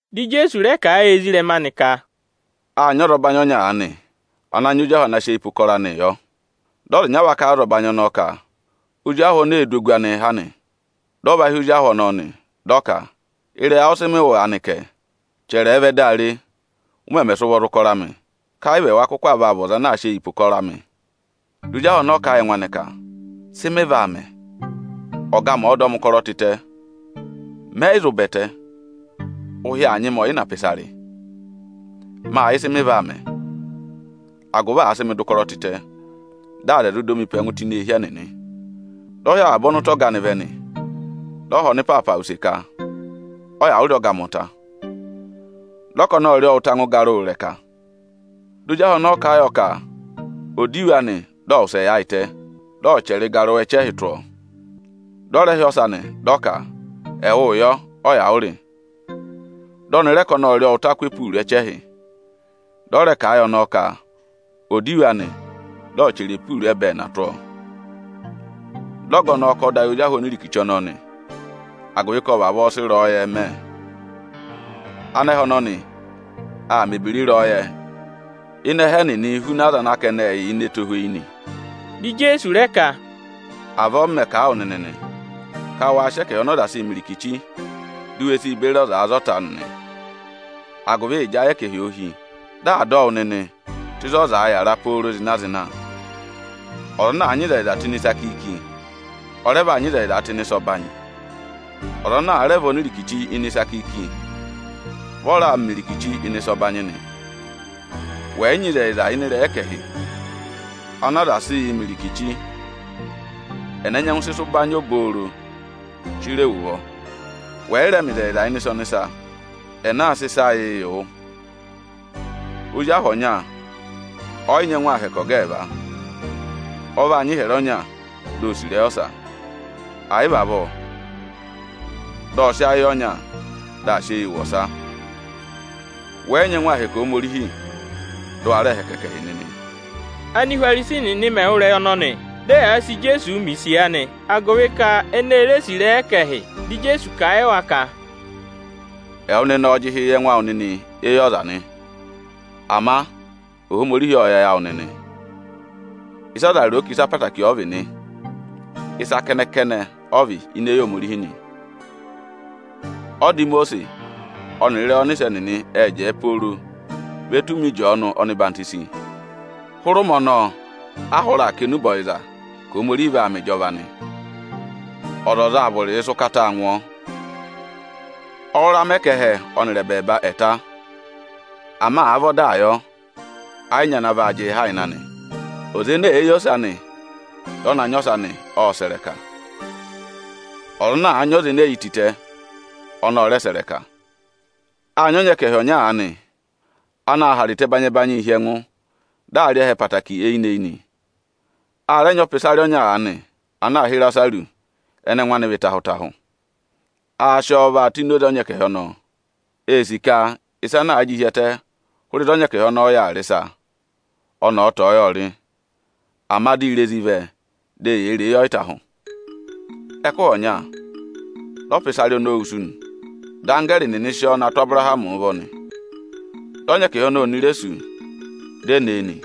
Dị Ijeesu rẹ kà a yị ezirẹma anị ka, “Â nyị ọzọbanyị ọnya aanị ana nyị ozi ahụ ana sị eyi pe ụkọrọ anịị yọ. Dị ọza ịnya va kà a yị ọzọbanyị ọnọọ ka ozi ahụ ọnọọ ee du ogu anịị ha nị. Dị ọ va hị́ ozi ahụ ọnọọ, dị ọ ka: ‘Ịrẹyị awụ ịsị mị wụ́ aanị kẹ? Chẹrẹ ẹ vẹ dị a re, ụ mẹmẹ mẹ̀ ụkọrọ awụ; agụvị ka wẹ yị kụkụ sị eyi pe ụkọrọ amị.’ Dị ozi ahụ ọnọọ ka ẹ yị ẹngụ anị ka: ‘Sị mị vaa mẹ? Ọga amị aa dọ mị ụkọrọọ tịtẹ. Mẹ yị zụ ba ẹtẹ, ụhị aa nyị mị ọyịna pà ịsa rị. Ma sị yẹ ịsị mị vaa mẹ, agụvị àa sị mị dọ ụkọrọ tịtẹ, dị aza ẹ̀ zụ dọ mị pe ẹngụ tụ́ ini eehi ẹnịnị.’ Dị ọ hị́ avaba ọnụta ọga anị vẹ nị. Dị ọ họ̀ ọnịpaapa use ka: ‘Ọ yà ụ rị ọga amị ụta?’ Dị ọnọọ ka ọnị ộ rị ọ ụta angwẹ ịgarụwa ịrẹka nị. Dị ozi ahụ ọnọọ kà a yọ ka ọ̀ dọ iwe anị dị ọ̀ wụsẹ yaayịtẹ, dị ọ̀ chẹrẹ ịgarụwa ẹchẹhị tụ́ ọọ. Dị ọ rẹ hị́ ọsa nị, dị ọ ka: ‘Ẹwụụ yọ, ọ yà ụ rị?’ Dị ọnị rẹ ka ọnị ộ rị ọọ ụta akụ opuuru ẹchẹhị. Dị ọ rẹ kà a yị ọnọọ ka ọ̀ dọ iwe anị dị ọ̀ chẹrẹ opuuru ẹbẹẹna tụ́ ọọ. Dị ọga ọnọọ kà ọda yị ozi ahụ onirikichi ọnọọ nị, agụvị ka ộ vavọọ sị ịrẹyọyẹ mẹ. Anẹhẹ ọnọnị aa mẹ̀ ebira ịrẹyọyẹ ịnị ẹhẹ ẹnịnịị huna aza ana ka ẹnị yà ini ẹtohweyi nị.” Dị Ijeesu rẹ ka, “Avọọ m mẹ̀ kà a wụ nịnị nị, ka wa sị ẹkẹhị ọnị ụ zị oze asuvu nyị, di u we si beri aza za ọta nịnị! Agụvị ịjị ayị ẹkẹhị òo hí, dị à dọ wụ nịnị tụ́ ịzị ọzaā yàra pooro zịna-zịna. Ọza ana àa nyị ịzẹyịza tụ́ ịnị ịsa kiiki, ọ rẹ vaa nyị ịzẹyịzaa tụ́ ịnị ịsa ọbanyị. Ọza ana àa rẹ vị onirikichi ịnị ịsa kiiki, vị ọ raa yịị mẹ irikichi ịnị ịsa ọbanyị nị. Wẹ̀ yị nyị ịzẹyịza ịnị ịrẹyị ẹkẹhị ọnị ụ zị oze asuvu nyị, ẹnẹ nyẹngụ sị ịsa ụbanyị obooro chire wu ụvọ? Wẹ̀ yị rẹ mẹ ịzẹyịza ịnị ịsa ọnịsa, ẹnẹ aa sị ịsa awụụ yị wụ? “Ozi ahụ ọnya ọ yị nyẹngụ aa hẹkẹ ọga ẹẹva. Ọ vaa nyị ịhyẹrẹ ọnya, di o sì ịrẹyị ọsa; ẹ̀ yị vị avọọ, dị ọ sị ayị yị ọnya, dị aa sị eyii wụ ọsa. Wẹ yị nyẹngụ aa hẹkẹ Ohomorihi, dị ụ wa rẹẹ hẹkẹ ẹkẹhị nịnị.” Ánihwarisi nịnị mẹ̀ wụ́ ịrẹyị ọnọnị, dị ẹyaa sị Ijeesu mẹ̀ isiya nị, agụvị ka ẹnịnị ê sì ịrẹyị ẹkẹhị. Dị Ijeesu kà a yị wa ka, “Ẹwụ nịnị ọọ̄ jị ịhị yị ẹngụ awụ nịnị éyi ọza nị. Ama Ohomorihi ộ yẹ ayị awụ nịnị. Ịsị aza ro ka ịsa ẹtẹẹtẹrẹ ọ vị nị, ịsa kẹnẹ-kẹnẹ ọ vị ini eyi Ohomorihi nị. “Ọda Imosiisi ọnịrị ịrẹyị ọnịsẹ nịnị ẹ́ jẹẹ pooro ve tù ụmẹ Ịjọọnụ ọhwọzenyi. Hụrẹ ụmẹ ọnọọ a hụrẹ aa kà enube ọyịza ka Ohomorihi aa mẹ ịjọva nị. Ọzọza aa vụrịị sị ụkataa ngụ ọọ. Ọ rụra mẹ ka ẹhẹ ọnịrị ẹbẹẹba ẹ̀ ta; ama àa vị ọdaa yọ, ẹ yị nyị ana vaa jịị ha ịnị anị. Ịkọ 7.10,11Ọza ene èe yi ose anị, dị ọ na nyị ọsa nị, ộ sẹ̀ ịrẹka. Ọza ana àa na nyị ọnẹẹ ene e yi tịtẹ, ọnị ọ rẹ sẹ̀ ịrẹka.” “Â nyị ọnyẹkẹhị ọnya aanị anaā hara ịta ẹbanyị-ẹbanyịị hi ẹngụ, dị aa rị ẹhẹ ẹtẹẹtẹrẹ eyinị-eyinị. A rẹ nyị ọpịsarị ọnya aanị ana aā hị́ Ịrasarụsị ẹnẹ ẹngụ anị vị ịtahụ-ịtahụ. Aā sị ọọ vaa tụ́ enoze ọnyẹkẹhị ọnọọ. Ee sì ka ịsa ana àa jị hi ẹtẹ hụrẹ ịzị ọnyẹkẹhị ọnọọ yà aa rị ịsa, ọnị ọ̀ tọ̀ọ́ yọọ rị; ama dị irezi vẹ, di eyee ree yọ ịtahụ. Ẹkụhị ọnya, dị ọpịsarị ọnọọ wusu nị. Dị anggẹẹrị nịnị sị ọọ na yaayịtẹ pe Abụrahamị nị. Dị ọnyẹkẹhị ọnọọ oni re sú, di e ne e nị.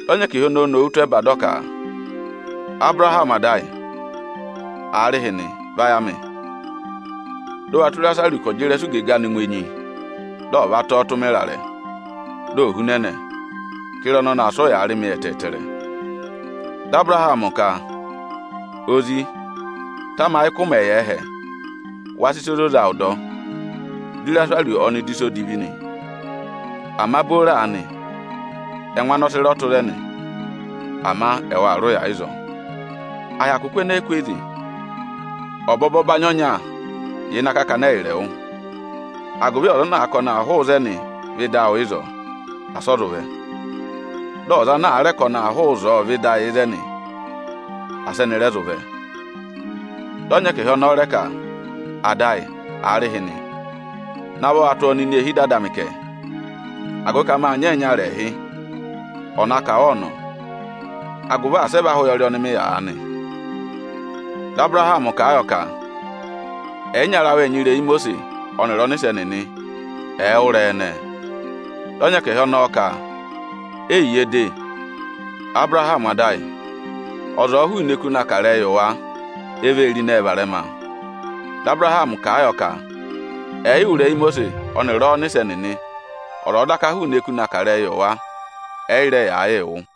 Ọnyẹkẹhị ọnọọ ô nowu tụ́ ẹba, dị ọ ka: ‘Abụrahamị ada ayị, aarịhịnị vayị amị, dị ụ wa tụ́ Ịrasarụsị ka ọ̀ jị ịrẹsụ igege anị ngụ enyi, dị ọ̀ va tọ ọ tụ́ mị ịrarẹ, di ò hunẹnẹ; ka ịra ọnọnị aa sị ụyaa rị mị ẹtẹẹtẹrẹ.’ Dị Abụrahamị ka: ‘Ozi, tamayị ka ụ mẹ̀ yà ẹhẹ, wâ dọ ịsa ọyịza-ọyịza, di Ịrasarụsị ọnị rị ụya ẹtẹẹtẹrẹ nị. Ama booro aanị, ẹngụ anị ọ sị rọ tụ́ ịzẹnị, ama ẹwụ aa rị ụya ịzọọ. À hyakụ kụ́ ẹnẹẹ kwooze, ọbọbọ ọbanyị ọnya yà ịnị akakana ẹyịrị ẹwụ; agụvị ọza ana àa ka ọnị aa hụụ ịzẹnị vẹ ịdị awụ ịzọọ, asị ọ zụ vẹ; dị ọza ana àa rẹ ka ọnị aa hụụ ịzọọ vẹ ịdị ẹyị ịzẹnị, asị ẹnị rẹ zụ vẹ.’ Dị ọnyẹkẹhị ọnọọ rẹ ka: ‘Ada ayị, aarịhịnị, navọ wa tụ́ ọ nọ ini eehi ada amị kẹ! Agụvị ka mâ nyị ẹyịnyara ẹẹhị, ọ̀ na kà wa ọnọ, agụvị asị ẹ vẹ aha ụyọrị ọnị mị yà aanị!’ Dị Abụrahamị kà a yọ ka: ‘Ẹyịnyara awụ ệ nyị ịrẹyị Imosiisi ọnịrị ọnịsẹ nịnị, ẹ̀ wụ́ ịrẹyị ẹnẹẹ!’ Dị ọnyẹkẹhị ọnọọ ka: ‘Eyiye de, Abụrahamị ada ayị, ọza ọ̀ọ hụụnị eku na kà ịrẹyị yị wa, e vee ro ịnẹẹ varẹma.’ Dị Abụrahamị kà a yọ ka: ‘Ẹ̀ yị wụ́ ịrẹyị Imosiisi ọnịrị ọ́ọnịsẹ nịnị, ọza ọ̀ọ daka hụụnị eku na kà ịrẹyị yị wa, ẹ yị rẹ yaa yịị wụ́.’”